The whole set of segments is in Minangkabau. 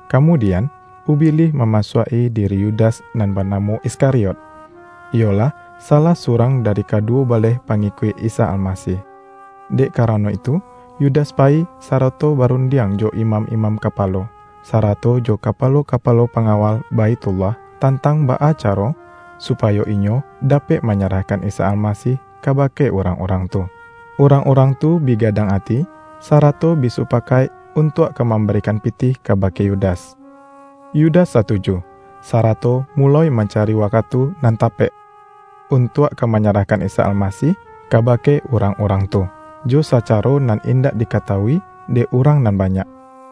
Kamudian, Ubilih mamasuak-i di-ri Yudas nan banamo Iskariot, iyolah, salah surang dari kaduwo baleh pangi-kuik Isa Almasih. Dek karano itu Yu-das payi, sarato barundiang jo imam-imam kapalo, sarato jo kapalo-kapalo pangawal Baithullah, tantang baa ca-ro, supayo inyo dapek manyarahkan Isa Almasih kabake urang-urang tu. Urang-urang tu bi gadang ati, sara-to bi supakaik untuak ka mambari-kan pitih kabake Yudas. Yudas satu-ju, sarato muloi mancari wakatu nan tapek, untuak ka manyarahkan Isa Almasih kabake urang-urang tu, jo sa-caro nan indak dikatawui dek urang nan banyak.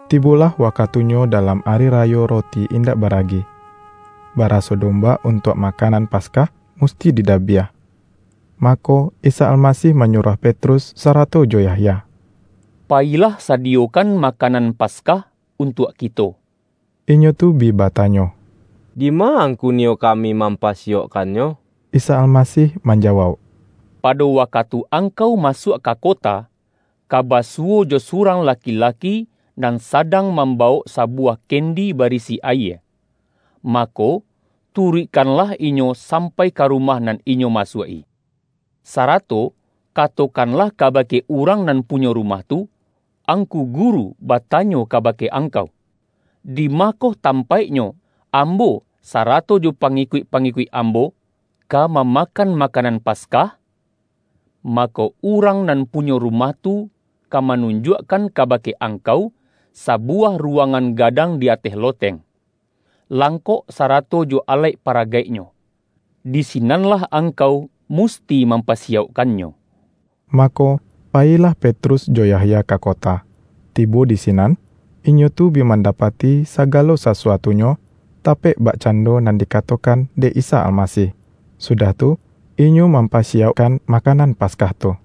Tibolah wakatunyo dalam Ari Rayo Roti Indak Baragi, baraso domba un-tuak makanan Paskah musti didabiah. Mako, Isa Almasih manyuruah Petrus sarato jo Yahya,”Payilah sadiyokan makanan Paskah untuak kito.” Inyo tu bi batanyo,”Dima Angku niyo kami mampasiyaukkannyo?” Isa Almasih manjawauk,”Pado wakatu angkau masuak ka kota, ka ba-suwo jo surang laki-laki, nan sadang mambawok sabuwah kendi barisi ayie. Mako, turuikkanlah inyo sampai ka ru-mah nan inyo masuak-i. Sarato kato-kanlah kabake urang nan punyo rumah tu: Angku Guru batanyo kabake ang-kau, ’Dimakoh tampaiknyo, Ambo sa-rato jo pangikuik-pangikuik Ambo, ka mamakan makanan Paskah?' Mako, urang nan punyo rumah tu, ka manun-juakkan kabake angkau, sabuwah ru-wangan gadang di ateh loteng, langkok sarato jo alaik paragaiknyo. Di sinanlah angkau musti mampasiyaukkannyo.” Mako, payilah Petrus jo Yahya ka kota, tibo di sinan, inyo tu bi manda-pati sagalo sasuatunyo, tapek bakcan-do nan dikatokan dek Isa Almasih. Sudah tu, inyo mampasiyaukkan ma-kanan Paskah tu.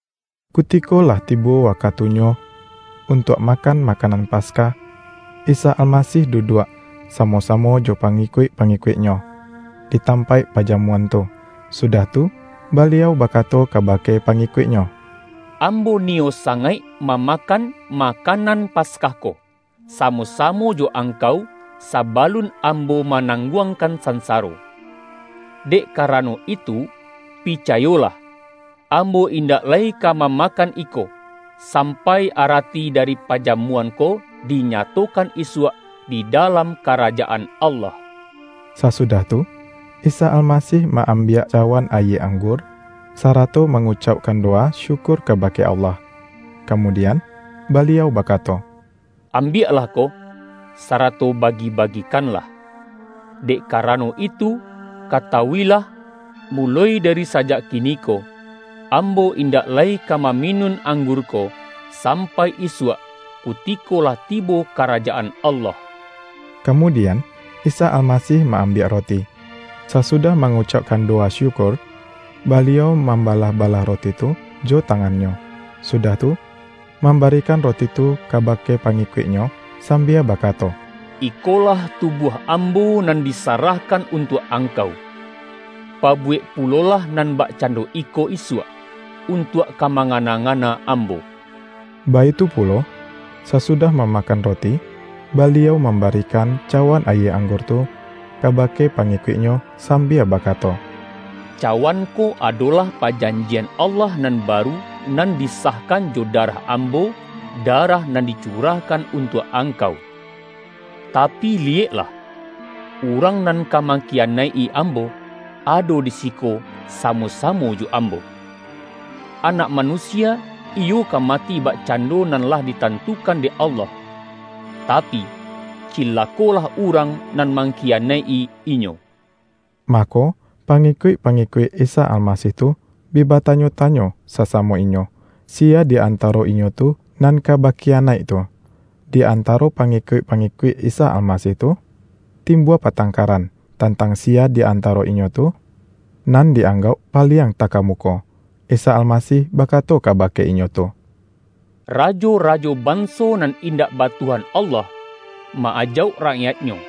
Kutiko lah tibo wakatunyo untuak makan makanan Paskah, Isa Almasih duduak, samo-samo jo pangikuik-pa-ngikuik-Nyo, di tampaik pajamuan tu. Sudah tu, Baliau bakato kabake pangikuik-Nyo,”Ambo niyo sangaik mamakan makanan Paskah ko, samo-samo jo angkau sabalun Ambo ma-nangguangkan sansaro! Dek kara-no itu, picayolah: Ambo indak lai ka mamakan iko, sampai arati dari paja-muan ko, dinyatokan isuak di dalam Karajaan Allah.” Sasudah tu, Isa Almasih ma-am-biak cawan ayie anggur, sarato mangu-caukkan dowa syukur kabake Allah, kamudian, Baliau bakato,”Ambiaklah ko, sarato bagi-bagikanlah; dek ka-rano itu, katawu-ilah: muloi dari sa-jak kiniko, Ambo indak lai ka mami-nun anggur ko, sampai isuak, kutiko lah tibo Karajaan Allah.” Kamudian, Isa Almasih ma-am-biak roti. Sasudah mangucaukkan do-wa syukur, Baliau mambalah-balah roti tu jo tangan-Nyo, sudah tu mam-barikan roti tu kabake pangikuik-Nyo, sambia bakato,”Ikolah tubuah Ambo, nan disarahkan untuak angkau. Pabu-wek pulolah nan bakcando iko isuak, untuak ka mangana-ngana Ambo.” Baitu pulo, sasudah mamakan roti, Baliau mambarikan cawan ayie ang-gur tu, kabake pangikuik-Nyo sam-bia bakato,”Cawan ko adolah pajan-jian Allah nan baru, nan disahkan jo darah Ambo darah nan dicurahkan untuak angkau.” ”Tapi liyeklah! Urang nan ka mangkiyanaik-i Ambo, ado di siko sa-mo-samo jo Ambo! Anak Manusia, iyo ka mati bakcando nan lah ditan-tukan dek Allah; tapi, cilakolah urang nan mangkiyanaik-i Inyo!” Mako, pangikuik-pangikuik Isa Almasih tu, bi batanyo-tanyo sasamo inyo, siya di antaro inyo tu nan ka bakiyanaik tu. Di antaro pangikuik-pangikuik Isa Almasih tu, timbua patangkaran, tantang siya di antaro inyo tu, nan di-anggauk paliang takamuko. Isa Almasih bakato kabake inyo tu,”Rajo-rajo banso nan indak ba Tuhan Allah, ma-ajauk rakyaiknyo,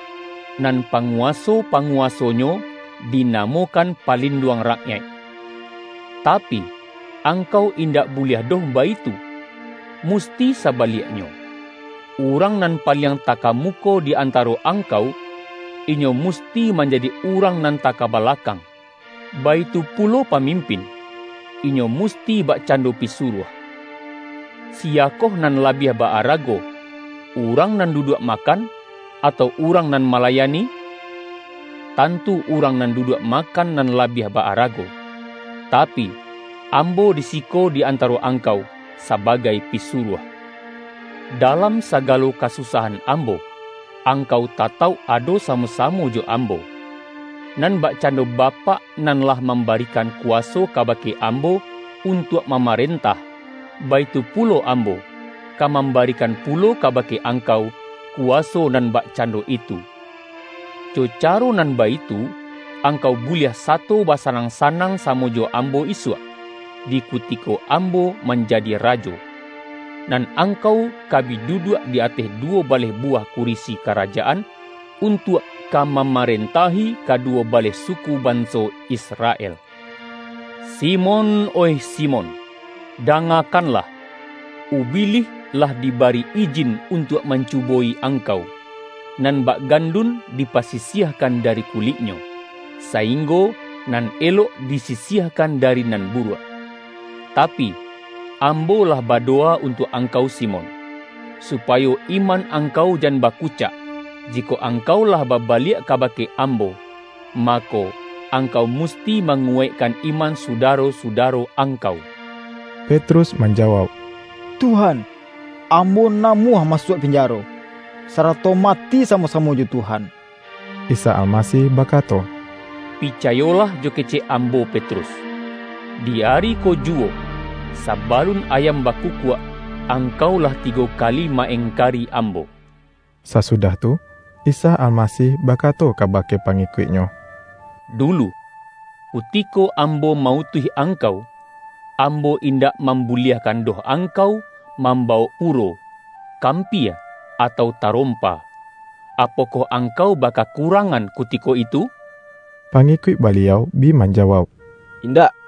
nan panguwa-so-panguwasonyo dinamokan ’Palin-duang Rakyaik'. Tapi, angkau indak buliah doh baitu. Musti sabaliaknyo, urang nan paliang takamuko di anta-ro angkau, inyo musti manjadi urang nan takabalakang, baitu pulo pamim-pin, inyo musti bakcando pisuruah. Siyakoh nan labiah ba-arago: urang nan duduak makan, atau urang nan malayani? Tantu urang nan duduak makan nan labiah ba-arago. Tapi, Ambo di siko di antaro angkau, saba-gai pisuruah. Dalam sagalo kasusahan Ambo, angkau tatauk ado samo-samo jo Ambo. Nan bakcando Bapak nan lah mambarikan kuwaso kabake Am-bo untuak mamarentah, baitu pulo Ambo, ka mambarikan pulo kabake angkau, kuwaso nan bakcando itu. Jo caro nan baitu, angkau buliah sato basanang-sanang samo jo Ambo isuak, di kutiko Ambo manjadi Rajo. Nan angkau ka bi duduak di ateh du-wo baleh buwah kurisi karajaan, un-tuak ka mamarentahi kaduwo baleh suku banso Israel.” ”Simon, oih Simon, dangakanlah! Ubilih lah dibari ijin untuak mancubo-i angkau; nan bak gandun dipasisiahkan dari kuliknyo, sainggo nan elok disi-siahkan dari nan buruak. Tapi, Ambo lah badowa untuak angkau Simon, su-payo iman angkau jan bakucak. Jikok angkau lah babaliak kabake Ambo, mako, angkau musti manguwaikkan iman sudaro-sudaro angkau.” Petrus manjawauk,”Tuhan, ambo namuah masuak pinjaro, sarato mati samo-samo jo Tuhan!” Isa Almasih bakato,”Picayolah jo kecek Ambo Petrus, di ari ko juwo, sa-balun ayam bakukuak, angkau lah ti-go kali ma-engkari Ambo.” Sasudah tu, Isa Almasih bakato kabake pangikuik-Nyo,”Dulu, kutiko Ambo ma-utuih angkau, Ambo indak mambuliahkan doh angkau mambawok puro, kampia atau tarompa, apokoh angkau bakakurangan kutiko itu?” Pangikuik Baliau bi manjawauk,”Indak!”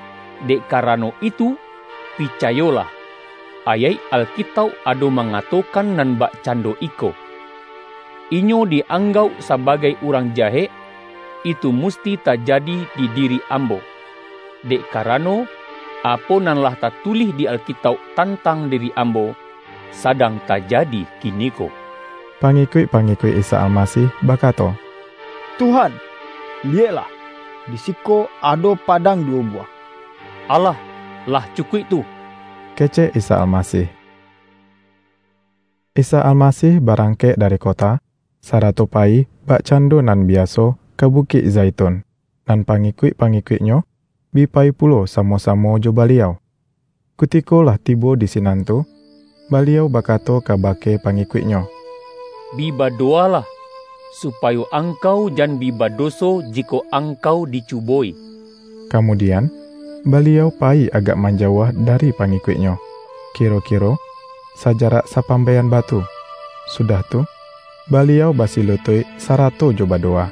Dek karano itu, pi-cayolah, ayaik Alkitauk ado mangato-kan nan bakcando iko, ’ Inyo di-ang-gauk sabagai urang jahek,' itu musti tajadi di diri Ambo. Dek karano, apo nan lah tatulih di Alkitauk tantang di-ri Ambo, sadang tajadi kiniko.” Pangikuik-pangikuik Isa Almasih bakato,”Tuhan, liyeklah, di siko ado padang duwo buwah.””Alah, lah cukuik tu!” kecek Isa Almasih. Isa Almasih barangkek dari ko-ta, sarato payi bakcando nan biaso ka Bukik Zaitun, nan pangikuik-pangi-kuik-Nyo, bi payi pulo samo-samo jo Baliau. Kutiko lah tibo di sinan tu, Baliau bakato kabake pangikuik-Nyo,”Bi badowalah, supayo angkau jan bi badoso jikok angkau dicubo-i.” Kamudian, Baliau payi agak man-jauah dari pangikuik-Nyo, kiro-kiro sajarak sapambae-an batu, sudah tu, Baliau basilutuik, sarato jo badowa.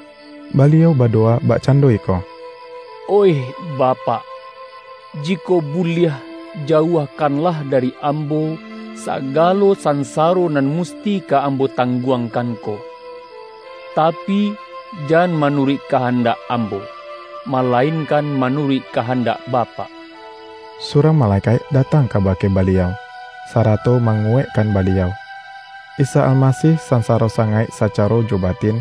Baliau badowa bakcando iko,”Oih Bapak, jikok buliah, jauahkanlah da-ri Ambo, sagalo sansaro nan musti ka Ambo tangguangkan ko. Tapi, jan ma-nuruik kahandak Ambo, malainkan manuruik kahandak Bapak.” Surang malekaik datang kabake Baliau, sarato manguwaikkan Baliau. Isa Almasih sansaro sangaik sacaro jo batin,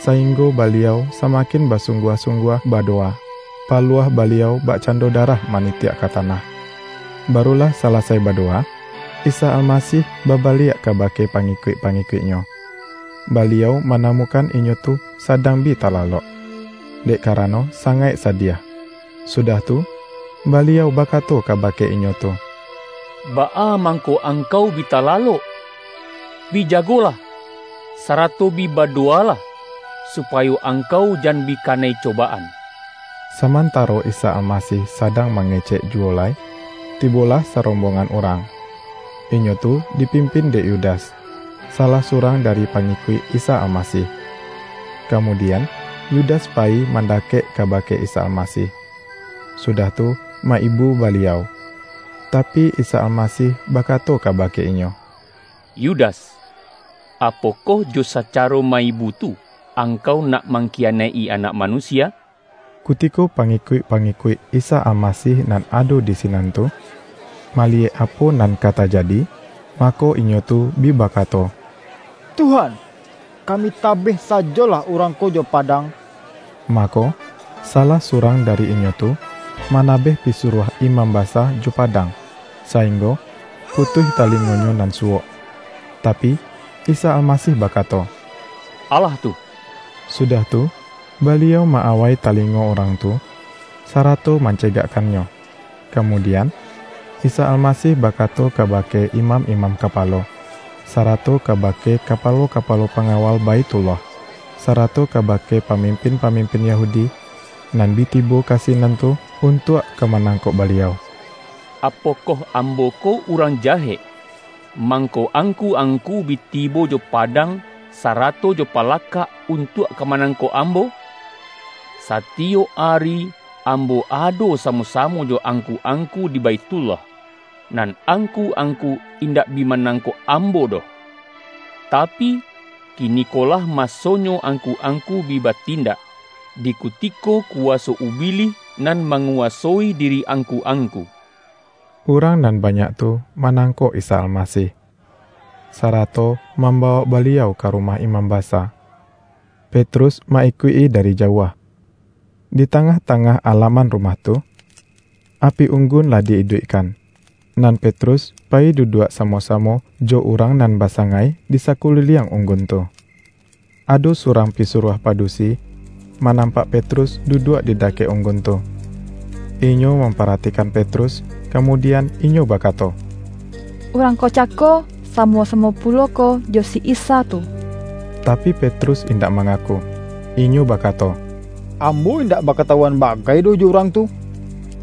saing-go Baliau samakin basungguah-sung-guah badowa. Paluah Baliau bakcan-do darah manitiak ka tanah. Baru lah salasai badowa, Isa Almasih babaliak kabake pangikuik-pangikuik-Nyo. Baliau manamukan inyo tu sadang bi talalok, dek kara-no sangaik sadiah. Sudah tu, Baliau bakato kabake inyo tu,”Baa mangko angkau bi talalok? Bi jagolah, sarato bi badowalah, supayo angkau jan bi kanai cobaan.” Samantaro Isa Almasih sadang ma-ngecek juwo lai, tibolah sarombong-an urang. Inyo tu dipimpin dek Yu-das, salah surang dari pangikuik Isa Almasih. Kamudian, Yudas payi man-dakek kabake Isa Almasih, sudah tu, ma-ibu Baliau. Tapi, Isa Almasih ba-kato kabake inyo,”Yudas, apokoh jo sacaro ma-ibu tu, angkau nak mang-kiyanaik-i Anak Manusia?” Kutiko pangikuik-pangikuik Isa Almasih nan ado di sinan tu, mali-yek apo nan ka tajadi, mako inyo tu bi bakato,”Tuhan, kami tabeh sajo-lah urang ko jo padang!” Mako, sa-lah surang dari inyo tu, manabeh pi-suruah imam basa jo padang, sainggo putuih talingonyo nan suwok. Tapi, Isa Almasih bakato,”Alah tu!” Sudah tu Baliau ma-awai talingo urang tu, sarato mancegakkannyo. Kamudian, Isa Almasih bakato ka-bake imam-imam kapalo, sarato kaba-ke kapalo-kapalo pangawal Baithullah, sarato kabake pamimpin-pamimpin Yahudi, nan bi tibo ka sinan tu un-tuak ka manangkok Baliau,”Apokoh Ambo ko urang jahek, mangko angku-angku bi tibo jo padang, sarato jo pa-lakak, untuak ka manangkok Ambo? Satiyok ari, Ambo ado samo-samo jo angku-angku di Baithullah, nan ang-ku-angku indak bi manangkok Ambo doh. Tapi, kinikolah masonyo angku-angku bi batindak, di kutiko kuwa-so ubilih nan manguwasoi diri ang-ku-angku.” Urang nan banyak tu manangkok Isa Almasih, sarato mambawok Baliau ka rumah imam basa. Petrus ma-ikuik-i dari jauah. Di tangah-tangah alaman rumah tu, api unggun lah di-iduikkan, nan Petrus payi duduak samo-samo, jo urang nan basangai di sakuliliang ung-gun tu. Ado surang pisuruah padu-si, manampak Petrus duduak di dakek unggun tu; inyo mamparatikan Petrus, kamudian, inyo bakato,”Urang ko cako, samo-samo pulo ko jo si Isa tu!” Tapi, Petrus indak mangaku. Inyo bakato,”Ambo indak bakatawuan ba-gai doh jo Urang tu!”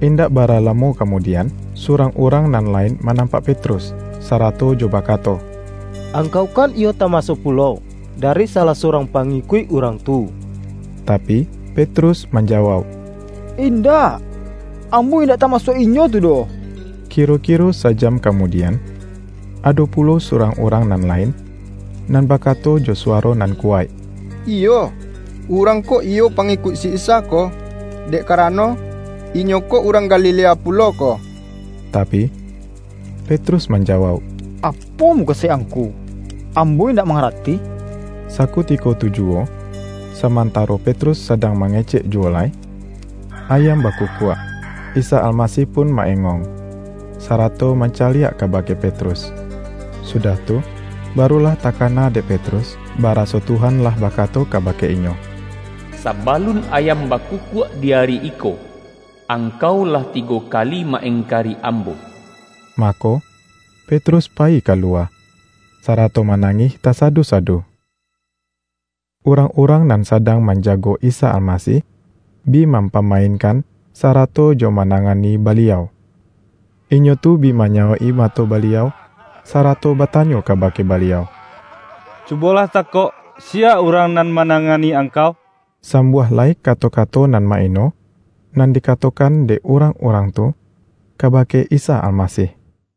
Indak bara lamo kamudian, surang urang nan lain manampak Petrus, sarato jo bakato,”Angkau kan iyo tamasuak pulo, dari salah surang pangikuik Urang tu!” Tapi, Petrus manjawauk,”Indak, am-bo indak tamasuak inyo tu doh!” Kiro-kiro sa-jam kamudian, ado pulo surang urang nan lain, nan baka-to jo suwaro nan kuwaik,”Iyo, urang ko iyo pangikuik si Isa ko, dek karano, inyo ko urang Galilea pulo ko!” Tapi, Petrus manjawauk,”Apo mu-kasuik angku, ambo indak manga-rati!” Sakutiko tu juwo, samantaro Petrus sadang mangecek juwo lai, ayam baku-kuak. Isa Almasih pun ma-engong, sarato mancaliak kabake Petrus. Su-dah tu, baru lah takana dek Petrus, baraso Tuhan lah bakato kabake inyo,”Sabalun ayam bakukuak di ari iko, angkau lah tigo kali ma-engkari Am-bo.” Mako, Petrus payi ka luwa, sa-rato manangih tasadu-sadu. Urang-urang nan sadang manjago Isa Almasih, bi mampamainkan, sara-to jo manangani Baliau. Inyo tu bi manyawok-i mato Baliau, sarato ba-tanyo kabake Baliau,”Cubolah takok, siya urang nan manangani Angkau?” Sambuah lai kato-kato nan ma-ino, nan dikatokan dek urang-urang tu ka-bake Isa Almasih.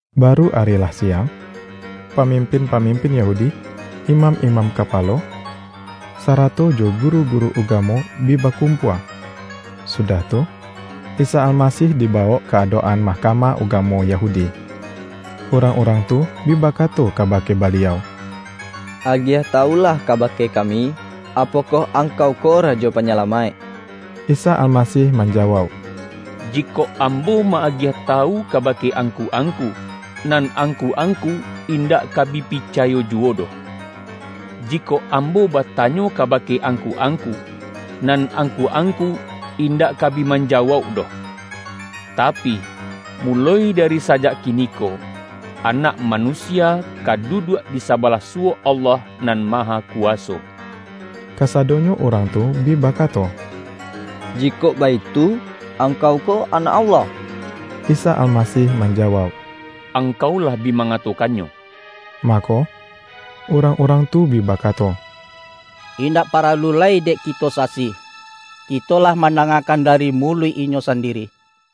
Baru ari lah siang, pamimpin-pamimpin Yahudi, imam-imam ka-palo, sarato jo guru-guru ugamo bi bakumpua, sudah tu, Isa Almasih di-bawok ka adok-an Mahkamah Uga-mo Yahudi. Urang-urang tu bi ba-kato kabake Baliau,”Agiah tawulah kabake kami, apokoh Angkau ko Rajo Panyalamaik?” Isa Almasih manjawauk,”Jikok Ambo ma-agiah tawu kabake angku-angku, nan angku-angku, indak ka bi picayo juwo doh. Jikok Ambo batanyo ka-bake angku-angku, nan angku-angku, indak ka bi manjawauk doh. Tapi, muloi dari sajak kiniko, Anak Manu-sia ka duduak di sabalah suwok Allah Nan Mahakuwaso.” Kasadonyo urang tu bi bakato,”Ji-kok baitu, Angkau ko Anak Allah?” Isa Almasih manjawauk,”Angkau lah bi mangatokannyo.” Mako, urang-urang tu bi bakato,”Indak paralu lai dek kito sasi! Kito lah mandangakan dari muluik Inyo sandiri!”